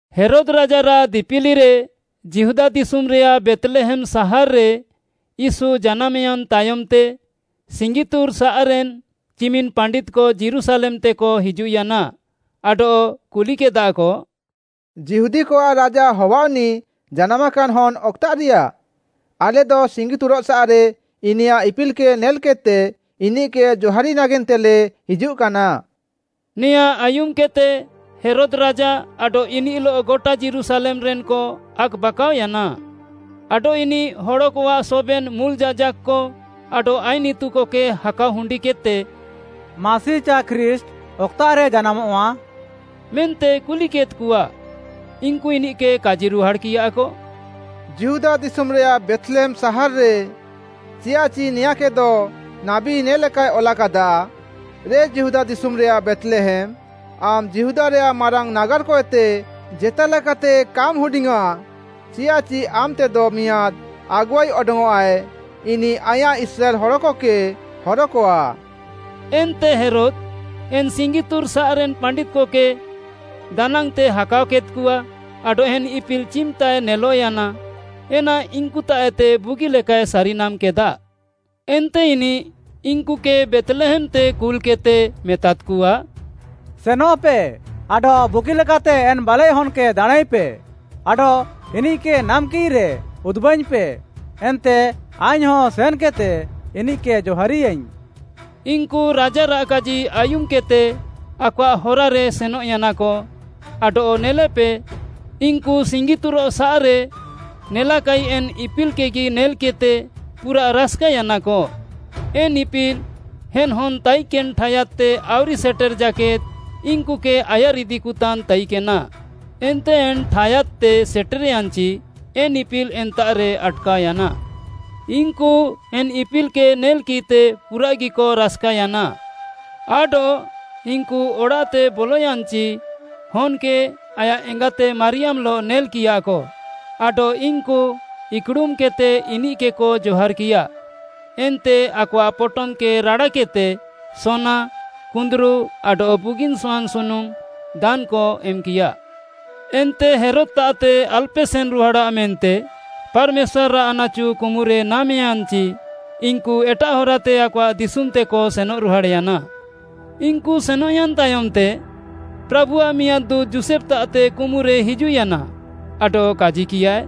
ହେରୋଦ୍‌ ରାଜାରାଃ ଦିପିଲିରେ ଯିହୁଦା ଦିଶୁମ୍‌ରେୟାଃ ବେଥ୍‌ଲେହେମ୍‌ ସାହାର୍‌ରେ ୟୀଶୁ ଜାନାମ୍‌ୟାନ୍‌ ତାୟମ୍‌ତେ, ସିଙ୍ଗିତୁରଃସାଃରେନ୍‌ ଚିମିନ୍‌ ପାଣ୍ଡିତ୍‌କ ଯୀରୁଶାଲେମ୍‌ତେକ ହିଜୁଃୟାନା, ଆଡଃ କୁଲିକେଦାଃକ, “ଯିହୁଦୀକଆଃ ରାଜା ହବାଅଃନିଃ ଜାନାମାକାନ୍‌ ହନ୍‌ ଅକ୍‌ତାଃରିୟା? ଆଲେଦ ସିଙ୍ଗିତୁରଃସାଃରେ ଇନିୟାଃ ଇପିଲ୍‌କେ ନେଲ୍‌କେଦ୍‌ତେ ଇନିଃକେ ଜହାରି ନାଗେନ୍ତେଲେ ହିଜୁଃକାନା।” ନେଆଁଁ ଆୟୁମ୍‌କେଦ୍‌ତେ ହେରୋଦ୍‌ ରାଜା ଆଡଃ ଇନିଃଲଃ ଗଟା ଯୀରୁଶାଲେମ୍‌ରେନ୍‌କ ଆକ୍‌ବାକାଅୟାନା। ଆଡଃ ଇନିଃ ହଡ଼କଆଃ ସବେନ୍‌ ମୁଲ୍‌ ଯାଜାକ୍‌କ ଆଡଃ ଆଇନ୍‌ ଇତୁକକେ ହାକାଅ ହୁଣ୍ଡିକେଦ୍‌ତେ “ମାସି ଚାଏ ଖ୍ରୀଷ୍ଟ୍‌, ଅକ୍‌ତାଃରେ ଜାନାମଃଆ?” ମେନ୍ତେ କୁଲିକେଦ୍‌କଆ। ଇନ୍‌କୁ ଇନିଃକେ କାଜିରୁହାଡ଼୍‌କିୟାକ, “ଯିହୁଦା ଦିଶୁମ୍‌ରେୟାଃ ବେଥ୍‌ଲେହେମ୍‌ ସାହାର୍‌ରେ,” ଚିୟାଃଚି ନେଆଁଁକେଦ ନାବୀ ନେ'ଲେକାଏ ଅଲାକାଦା, “‘ରେ ଯିହୁଦା ଦିଶୁମ୍‌ରେୟାଃ ବେଥ୍‌ଲେହେମ୍‌, ଆମ୍‌ ଯିହୁଦାରେୟାଃ ମାରାଙ୍ଗ୍‌ ନାଗାର୍‌କଏତେ ଜେତାଲେକାତେ କାମ୍‌ ହୁଡିଙ୍ଗ୍‌ୟାଁ, ଚିୟାଃଚି ଆମେତେଦ ମିଆଁଦ୍‌ ଆଗୁଆଇ ଅଡଙ୍ଗ୍‌ଅଃଆଏ, ଇନିଃ ଆଇଁୟାଃ ଇସ୍ରାଏଲ୍‌ ହଡ଼କକେ ହରକଆ।’” ଏନ୍ତେ ହେରୋଦ୍‌, ଏନ୍‌ ସିଙ୍ଗିତୁରଃସାଃରେନ୍‌ ପାଣ୍ଡିତ୍‌କକେ ଦାନାଙ୍ଗ୍‌ତେ ହାକାଅକେଦ୍‌କଆ, ଆଡଃ ଏନ୍‌ ଇପିଲ୍‌ ଚିମ୍‌ତାଏ ନେଲଃୟାନା, ଏନା ଇନ୍‌କୁତାଃଏତେ ବୁଗିଲେକାଏ ସାରିନାମ୍‌କେଦା। ଏନ୍ତେ ଇନିଃ ଇନ୍‌କୁକେ ବେଥ୍‌ଲେହେମ୍‌ତେ କୁଲ୍‌କେଦ୍‌ତେ ମେତାଦ୍‌କଆ, “ସେନଃପେ ଆଡଃ ବୁଗିଲେକାତେ ଏନ୍‌ ବାଲେଃହନ୍‌କେ ଦାଣାଁଁଇପେ ଆଡଃ ଇନିଃକେ ନାମ୍‌କିଃରେ ଉଦୁବାଇଙ୍ଗ୍‌ପେ, ଏନ୍ତେ ଆଇଙ୍ଗ୍‌ହଁ ସେନ୍‌କେଦ୍‌ତେ ଇନିଃକେ ଜହାରିୟାଇଙ୍ଗ୍‌।” ଇନ୍‌କୁ ରାଜାରାଃ କାଜି ଆୟୁମ୍‌କେଦ୍‌ତେ ଆକଆଃ ହରାରେ ସେନଃୟାନାକ ଆଡଃ ନେଲେପେ, ଇନ୍‌କୁ ସିଙ୍ଗିତୁରଃସାଃରେ ନେଲାକାଇ ଏନ୍‌ ଇପିଲ୍‌କେଗି ନେଲ୍‌କିଃତେ ପୁରାଃ ରାସ୍‌କାୟାନାକ। ଏନ୍‌ ଇପିଲ୍‌, ଏନ୍‌ ହନ୍‌ ତାଇକେନ୍‌ ଠାୟାଦ୍‌ତେ ଆଉରି ସେଟେର୍‌ ଜାକେଦ୍‌ ଇନ୍‌କୁକେ ଆୟାର୍‌ ଇଦିକତାନ୍‌ ତାଇକେନା, ଏନ୍ତେ ଏନ୍‌ ଠାୟାଦ୍‌ତେ ସେଟେର୍‌ୟାନ୍‌ଚି, ଏନ୍‌ ଇପିଲ୍‌ ଏନ୍ତାଃରେ ଆଟ୍‌କାଅୟାନା। ଇନ୍‌କୁ ଏନ୍‌ ଇପିଲ୍‌କେ ନେଲ୍‌କିଃତେ ପୁରାଃଗିକ ରାସ୍‌କାୟାନା। ଆଡଃ ଇନ୍‌କୁ ଅଡ଼ାଃତେ ବଲୟାନ୍‌ଚି ହନ୍‌କେ ଆୟାଃ ଏଙ୍ଗାତେ ମାରିୟାମ୍‌ଲଃ ନେଲ୍‌କିୟାକ ଆଡଃ ଇନ୍‌କୁ ଇକ୍‌ଡ଼ୁମ୍‌କେଦ୍‌ତେ ଇନିଃକେକ ଜହାର୍‌କିୟା ଏନ୍ତେ ଆକଆଃ ପଟମ୍‌କେ ରାଡ଼ାକେଦ୍‌ତେ ସୋନା, କୁନ୍ଦୁରୁ ଆଡଃ ବୁଗିନ୍‌ ସହାନ୍‌ସୁନୁମ୍‌ ଦାନ୍‌କ ଏମ୍‌କିୟା। ଏନ୍ତେ ହେରୋଦ୍‌ତାଃତେ ଆଲ୍‌ପେ ସେନ୍‌ରୁହାଡ଼ାଃ ମେନ୍ତେ ପାର୍‌ମେଶ୍ୱାର୍‌ଆଃ ଆନାଚୁ କୁମୁରେ ନାମ୍‌ୟାନ୍‌ଚି, ଇନ୍‌କୁ ଏଟାଃ ହରାତେ ଆକଆଃ ଦିଶୁମ୍‌ତେକ ସେନଃରୁହାଡ଼୍‌ୟାନା। ଇନ୍‌କୁ ସେନଃୟାନ୍‌ ତାୟମ୍‌ତେ, ପ୍ରାଭୁଆଃ ମିଆଁଦ୍‌ ଦୁଁତ୍‌ ଯୋଷେଫ୍‌ତାଃତେ କୁମୁରେ ହିଜୁଃୟାନା ଆଡଃ କାଜିକିୟାଏ,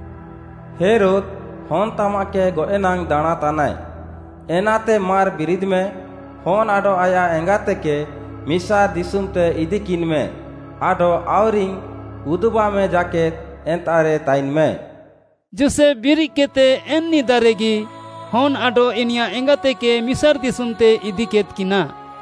“ହେରୋଦ୍‌, ହନ୍‌ତାମାଃକେ ଗଏଃନାଙ୍ଗ୍‌ ଦାଣାଁଁତାନାଏ, ଏନାତେ ମାର୍‌ ବିରିଦ୍‌ମେ, ହନ୍‌ ଆଡଃ ଆୟାଃ ଏଙ୍ଗାତେକେ ମିସାର୍‌ ଦିଶୁମ୍‌ତେ ଇଦିକିନ୍‌ମେ ଆଡଃ ଆଉରିଙ୍ଗ୍‌ ଉଦୁବାମେ ଜାକେଦ୍‌ ଏନ୍ତାଃରେ ତାଇନ୍‌ମେ।” ଯୋଷେଫ୍‌ ବିରିଦ୍‌କେଦ୍‌ତେ ଏନ୍‌ ନିଦାରେଗି ହନ୍‌ ଆଡଃ ଇନିୟାଃ ଏଙ୍ଗାତେକେ ମିସାର୍‌ ଦିଶୁମ୍‌ତେ ଇଦିକେଦ୍‌କିନା।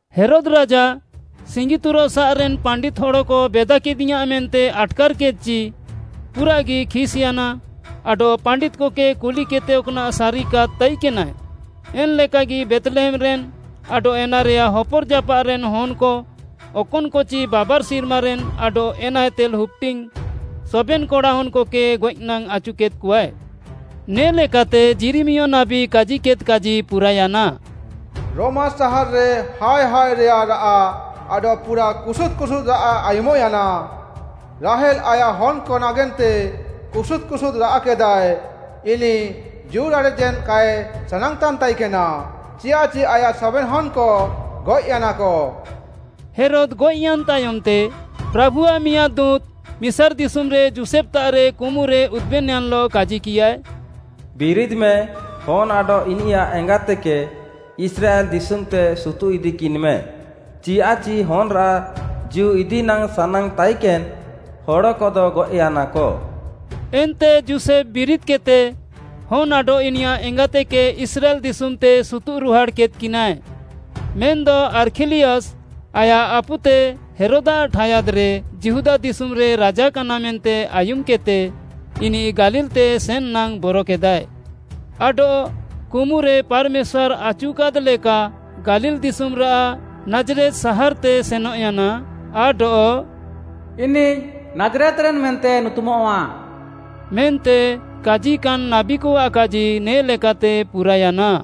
ହେରୋଦ୍‌ ରାଜା, ସିଙ୍ଗିତୁରଃସାଃରେନ୍‌ ପାଣ୍ଡିତ୍‌ ହଡ଼କ ବେଦାକେଦିୟାଁ ମେନ୍ତେ ଆଟ୍‌କାର୍‌କେଦ୍‍ଚି, ପୁରାଃଗି ଖିସ୍‌ୟାନା ଆଡଃ ପାଣ୍ଡିତ୍‌କକେ କୁଲିକେଦ୍‌ତେ ଅକ୍‌ନାଃ ସାରିକାଦ୍‌ ତାଇକେନାଏ, ଏନ୍‌ ଲେକାଗି ବେଥ୍‌ଲେହେମ୍‌ରେନ୍‌ ଆଡଃ ଏନାରେୟାଃ ହପର୍‌ଜାପାଃରେନ୍‌ ହନ୍‌କ, ଅକନ୍‌କଚି ବାବାର୍‌ ସିର୍ମାରେନ୍‌ ଆଡଃ ଏନାଏତେ ହୁପ୍‌ଡିଙ୍ଗ୍‌ ସବେନ୍‌ କଡ଼ାହନ୍‌କକେ ଗଏଃନାଙ୍ଗ୍‌ ଆଚୁକେଦ୍‍କଆଏ। ନେ ଲେକାତେ ଯିରିମିୟ ନାବୀ କାଜିଲେଦ୍ କାଜି ପୁରାୟାନା, “ରମା ସାହାର୍‌ରେ ହାୟ ହାୟରେୟାଃ ରାଆଃ ଆଡଃ ପୁରାଃ କୁସୁଦ୍‌ କୁସୁଦ୍‌ ରାଆଃ ଆୟୁମ୍‌ୟାନା, ରାହେଲ୍‌ ଆୟାଃ ହନ୍‌କ ନାଗେନ୍ତେ କୁସୁଦ୍‌ କୁସୁଦ୍‌ ରାଆଃ କେଦାଏ; ଇନିଃ ଜୀଉରାଡ଼େଜେନ୍‌ କାଏ ସାନାଙ୍ଗ୍‌ତାନ୍‌ ତାଇକେନା, ଚିୟାଃଚି ଆୟାଃ ସବେନ୍‌ ହନ୍‌କ ଗଏଃୟାନାକ।” ହେରୋଦ୍‌ ଗଏଃୟାନ୍‌ ତାୟମ୍‌ତେ, ପ୍ରାଭୁଆଃ ମିଆଁଦ୍‌ ଦୁଁତ୍‌ ମିସାର୍‌ ଦିଶୁମ୍‌ରେ ଯୋଷେଫ୍‌ତାଃରେ କୁମୁରେ ଉଦୁବେନ୍‌ୟାନ୍‌ଲଃ କାଜିକିୟାଏ, “ବିରିଦ୍‌ମେ, ହନ୍‌ ଆଡଃ ଇନିୟାଃ ଏଙ୍ଗାତେକେ ଇସ୍ରାଏଲ୍‌ ଦିଶୁମ୍‌ତେ ସୁତୁଃଇଦିକିନ୍‍ମେ, ଚିୟାଃଚି ହନ୍‌ରାଃ ଜୀଉ ଇଦି ନାଙ୍ଗ୍‌ ସାନାଙ୍ଗ୍‌ ତାଇକେନ୍‌ ହଡ଼କଦ ଗଏଃୟାନାକ।” ଏନ୍ତେ ଯୋଷେଫ୍‌ ବିରିଦ୍‌କେଦ୍‌ତେ ହନ୍‌ ଆଡଃ ଇନିୟାଃ ଏଙ୍ଗାତେକେ ଇସ୍ରାଏଲ୍‌ ଦିଶୁମ୍‌ତେ ସୁତୁଃରୁହାଡ଼୍‌କେଦ୍‍କିନାଏ। ମେନ୍‌ଦ ଆର୍ଖିଲିୟସ୍‌ ଆୟାଃ ଆପୁତେ ହେରୋଦ୍‌ଆଃ ଠାୟାଦ୍‌ରେ ଯିହୁଦା ଦିଶୁମ୍‌ରେ ରାଜାକାନା ମେନ୍ତେ ଆୟୁମ୍‌କେଦ୍‌ତେ, ଇନିଃ ଗାଲିଲ୍‌ତେ ସେନ୍‌ନାଙ୍ଗ୍‌ ବରକେଦାଏ। ଆଡଃ କୁମୁରେ ପାର୍‌ମେଶ୍ୱାର୍‌ ଆଚୁକାଦ୍‌ ଲେକା ଗାଲିଲ୍‌ ଦିଶୁମ୍‌ରାଃ ନାଜ୍‌ରେତ୍‌ ସାହାର୍‌ତେ ସେନଃୟାନା। ଆଡଃ “ଇନିଃ ନାଜ୍‌ରେତ୍‌ରେନ୍‌ ମେନ୍ତେ ନୁତୁମଃଆ।” ମେନ୍ତେ କାଜିକାନ୍‌ ନାବୀକଆଃ କାଜି ନେ ଲେକାତେ ପୁରାୟାନା।